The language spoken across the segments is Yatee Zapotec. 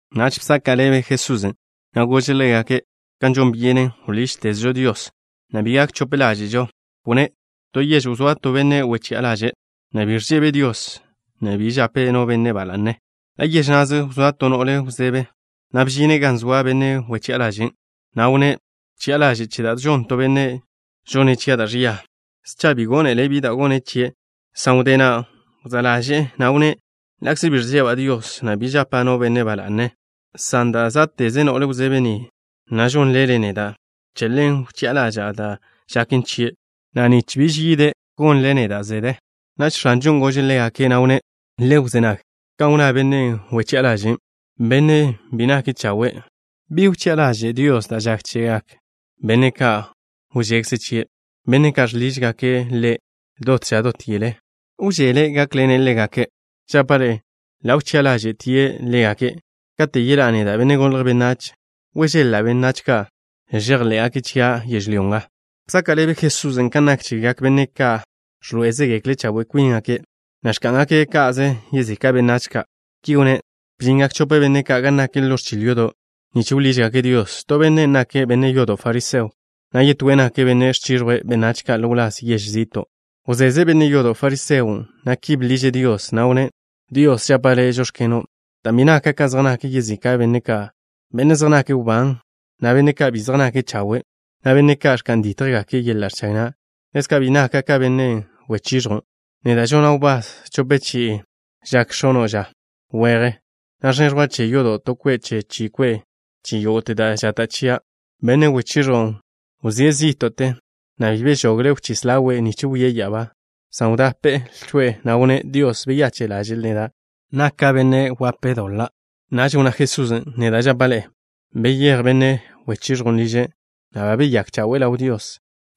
Naž bzaka' ḻebe Jesusen', na' gože' ḻégake' kan žon byenen wḻížtezžo Dios, na' bi gak chope ḻáže'žo. Wnné': —To yež wzóa to benne' wechi'a ḻaže', na' bi ẕžebe' Dios, na' bi žape' no benne' ba la'ne. Ḻa' yež na'ze wzóa to no'le wzebe, na' bžine' gan zoa benne' wechi'a ḻažen', na' wnné': “Bchi'a ḻaže' che da' žon to benne', žone' chia' da' ẕia.” Scha bi gónele' bi da' gone' chie', san wdé na' wzá' ḻaže'e, na' wnné': “Ḻa'kze bi ẕžeba' Dios, na' bi žapa' no benne' ba la'ne, san dan' zá'teze no'le wzebe ni, na' žon ḻele' neda', che ḻen wchi'a ḻaža'a da' žaken chie', nich bi yídteze' ga ni, na' nich bi tetle gon ḻele' neda'.” Naž X̱anžon' gože' ḻégake', na' wnné': —Le wzé nag kan wnná bennen' wechi'a ḻažen', bennen' bi nake' chawe'. ¿Bi wchi'a ḻaže' Dios da' žak chegak benne' ka' wžekze' chie', benne' ka' žḻižgake' Ḻe' dot ža dot yele? ¿Wžele' gákḻene' ḻégake'? Žapa' ḻe'e: ḻa' wchi'a ḻáže'tie' ḻégake'. Kate' yeḻá'a neda', Benne' Golje' Benách, ¿wežeḻ-la' benne' ka' žejḻé'gake' chia' yežlyó nga? Bzaka' ḻebe Jesusen' kan nak chegak benne' ka' ẕḻoé'ezegekle' chawe' kwíngake', na' ẕká'ngake' ka'ze yezika' benách ka'. Ki wnné': —Bžingak chope benne' gan nak ḻo ẕchil yodo' nich wḻížgake' Dios. To bennen' nake' benne' yodo' fariseo, na' yetóen' nake' benne' ẕchiẕjwe' benách ka' ḻo wláz yež zi'to'. Wzeze benne' yodo' fariseon', na' ki bḻiže' Dios, na' wnné': “Dios, žapa' Le': žóx̱keno', dan' bi naka' ka zej nak yezika' benne' ka', benne' zej nake' wbán, na' benne' ka' bi zej nake' chawe', na' benne' ka' ẕka'n dítjgake' yeḻa' ẕchag na'. Ḻezka' bi naka' ka benne' wechiẕjwn'. Neda' žona' wbás chope chi'i žak x̱ono' ža weje, na' ẕneẕjwa' che yodo' to kwe' che chi kwe' che yógo'te da' žata' chia'.” Benne' wechiẕjwn' wzíe' zí'to'te, na' bi bežogle' wchís ḻawe' nich wie' ya'abá, san wdape' lcho'e, na' wnné': “Dios, beyache' ḻaže'l neda', benne' doḻa'.” Naž wnná Jesusen': —Neda' žapa' ḻe'e: beyéj benne' wechiẕjwn' liže', na' ba beyake' chawe' ḻaw Dios,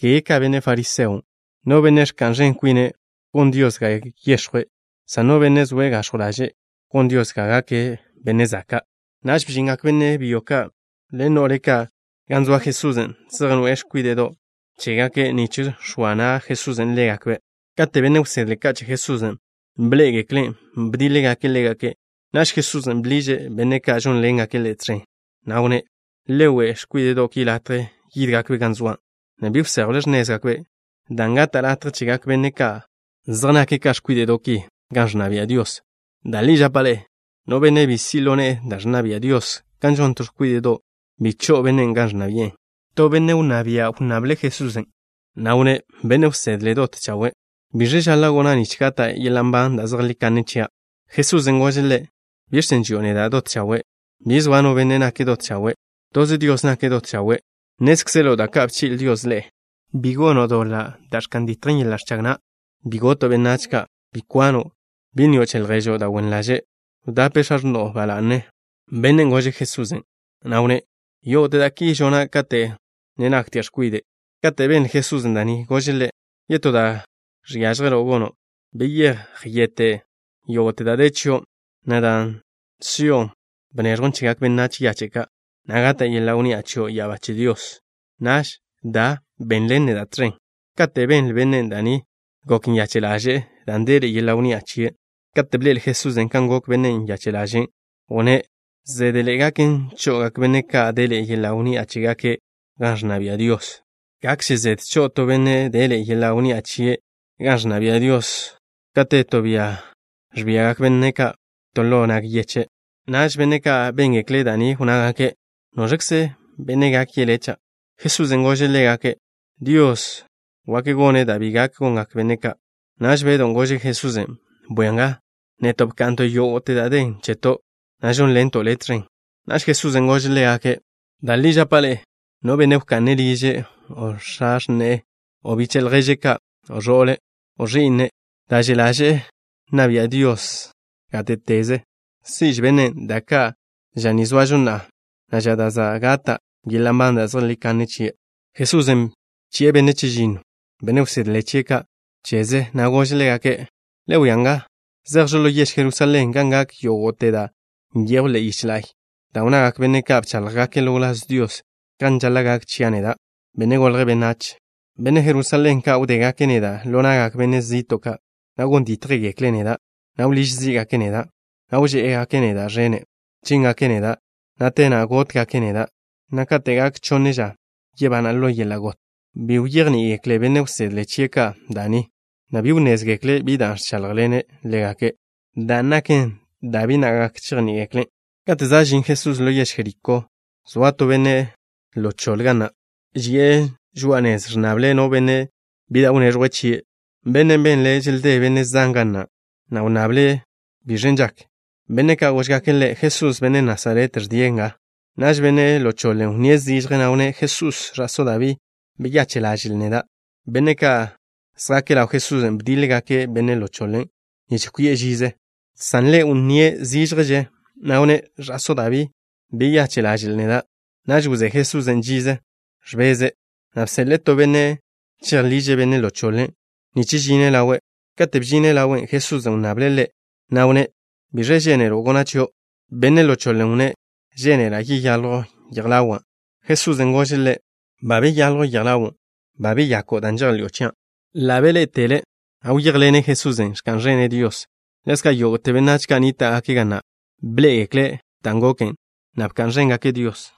kege ka benne' fariseon'. No benne' ẕka'n ẕen kwine', gon Dios ga yex̱jwe', san no benne' zoe' gax̱jw ḻaže', gon Dios ga gake' benne' zaka'. Naž bžingak benne' byo ka' ḻen no'le ka' gan zoa Jesusen', zej noe'e x̱kwíde'do' ka' chégake' nich x̱oa na' Jesusen' ḻégakbe'. Kate' benne' wsedle ka' che Jesusen' bḻé'egeklen', bdíḻegake' ḻégake'. Naž Jesusen' bḻiže' benne' ka' žónḻengake' Ḻe' tẕen, na' wnné': —Le we' x̱kwíde'do' ki latje yídgakbe' gan zoa', na' bi wséjwle x̱nézgakbe', dan' gata' latje chegak benne' ka' zej nake' ka x̱kwíde'do' ki gan ẕnna bia' Dios. Da' li žapa' ḻe'e: no benne' bi si' ḻo ne'e da' ẕnna bia' Dios, kan žon to x̱kwíde'do', bi cho'o bennen' gan ẕnna bi'e. To benne' wnná bia' wnnable' Jesusen', na' wnné': —Benne' wsedle dot chawe'. ¿Biẕe žaḻa' gona' nich gata' yeḻa' nban da' zejlí kanne chia'? Jesusen' gože' ḻe': —¿Biẕ chen' ži'o neda': “Dot chawe'”? Bi zoa no benne' nake' dot chawe'. Toze Dios nake' dot chawe'. Nnézkzelo' da' ka' bchi'le Dios ḻe'e: Bi gono' doḻa' da' ẕka'n ditjen yeḻa' ẕchag na'. Bi goto' benách ka'. Bi kwano'. Bi nnio' che lježo' da' wen ḻaže'. Wdape x̱a x̱no'o ba la'ne. Bennen' gože' Jesusen', na' wnné': —Yógo'te da' ki žona' kate' wzó ḻaw naka' x̱kwide'. Kate' benle Jesusen' da' ni, gože' ḻe': —Yetó da' žiažje gono'. Bete' yógo'te da' den chio', na' dan' si'o bneẕjwn chegak benách yache' ka', na' gata' yeḻa' wnni'a chio' ya'abá che Dios. Naž da, benḻen neda' tẕen. Kate' benle bennen' da' ni, gok nyache' ḻaže'e, dan' deḻe'e yeḻa' wnni'a chie'. Kate' bḻe'el Jesusen' kan gok bennen' nyache' ḻaže', wnné': —Zédeḻe'e gaken cho'ogak benne' ka' deḻe'e yeḻa' wnni'a chégake' gan ẕnna bia' Dios. Gakže zede cho'o to benne' deḻe'e yeḻa' wnni'a chie' gan ẕnna bia' Dios, ka te to bia ẕbiagak benne' ka' to ḻo nag yeche'. Naž benne' ka' béngekle' da' ni wnnágake': —¿Noẕkze benne' gak yelé', cha'? Jesusen' gože' ḻégake': —Dios gak gone' da' bi gak gongak benne' ka'. Naž Bedw gože' Jesusen': —Bwia nga, neto' bka'nto' yógo'te da' den cheto', na' žónḻento' Le' tẕen. Naž Jesusen' gože' ḻégake': —Da' li žapa' ḻe'e, no benne' wka'ne' liže', o x̱a x̱ne'e, o biche' lježe' ka', o ẕo'le', o ẕi'ne' ka', dan' že' ḻaže'e nna bia' Dios gáte'teze, si'že bennen' da' ka' ža ni zoažo na'a, na' ža da' za' gata' yeḻa' nban da' zejlí kanne chie'. Jesusen' bchi'e benne' chežinno, benne' wsedle chie' ka', cheze, na' gože' ḻégake': —Le wia nga, zejžo ḻo yež Jerusalén, gan gak yógo'te da' nyejw ḻe'e yich la'y, da' wnnagak benne' ka' bcháḻjgake' ḻo wláz Dios, kan žaḻa' gak chia' neda', Benne' Golje' Benách. Benne' Jerusalén ka' wdégake' neda' ḻo na'gak benne' zi'to' ka', na' gon dítjgekle' neda', na' wḻíž zí'gake' neda', na' wžé'egake' neda' ẕene'. Chíngake' neda', na' te na' gótgake' neda', na' kate' gak chonne ža, yebana' ḻo yeḻa' got. Bi wyejní'igekle benne' wsedle chie' ka' da' ni, na' bi wnnézgekle' bi da' ẕcháḻjḻene' ḻégake' chen, dan' naken da' bi na' gak chejní'igekle'. Kate' za' žin Jesusen' ḻo yež Jerikó, zoa to benne' ḻo choḻe ga na'. Ži'e žoa'a nez, ẕnnable' no benne' bi da' wneẕjwe' chie'. Bennen' benle' želdé benne' zan ga na', na' wnnabe' biẕen' žaken. Benne' ka' góžgake' ḻe': —Jesús, benne' Nasaret, ẕdie' nga. Naž benne' ḻo choḻen' wnníe' zižje, na' wnné': —Jesús, ẕa'só Dabí, beyache' ḻaže'l neda'. Benne' ka' zjake' ḻaw Jesusen' bdíḻegake' benne' ḻo choḻen' nich kwi'e žize, san ḻe' wnníe' zížježe, na' wnné': —Ẕa'só Dabí, beyache' ḻaže'l neda'. Naž wzé Jesusen' žize, ẕbeze', na' bseḻe'e to benne' chejḻiže' benne' ḻo choḻen' nich žine' ḻawe'. Kate' bžine' ḻawe', Jesusen' wnnable' ḻe', na' wnné': —¿Biẕe žénelo' gona' chio'? Benne' ḻo choḻen' wnné': —Žénela' yeyaljw yej ḻawa'. Jesusen' gože' ḻe': —Ba beyaljw yej ḻawo'. Ba beyako' dan' žejḻi'o chia'. Ḻa' beḻé'etele', na' wyéjḻene' Jesusen', ẕka'n ẕene' Dios. Ḻezka' yógo'te benách ka' nníta'gake' ga na' bḻé'egekle' dan' goken, na' bka'n ẕéngake' Dios.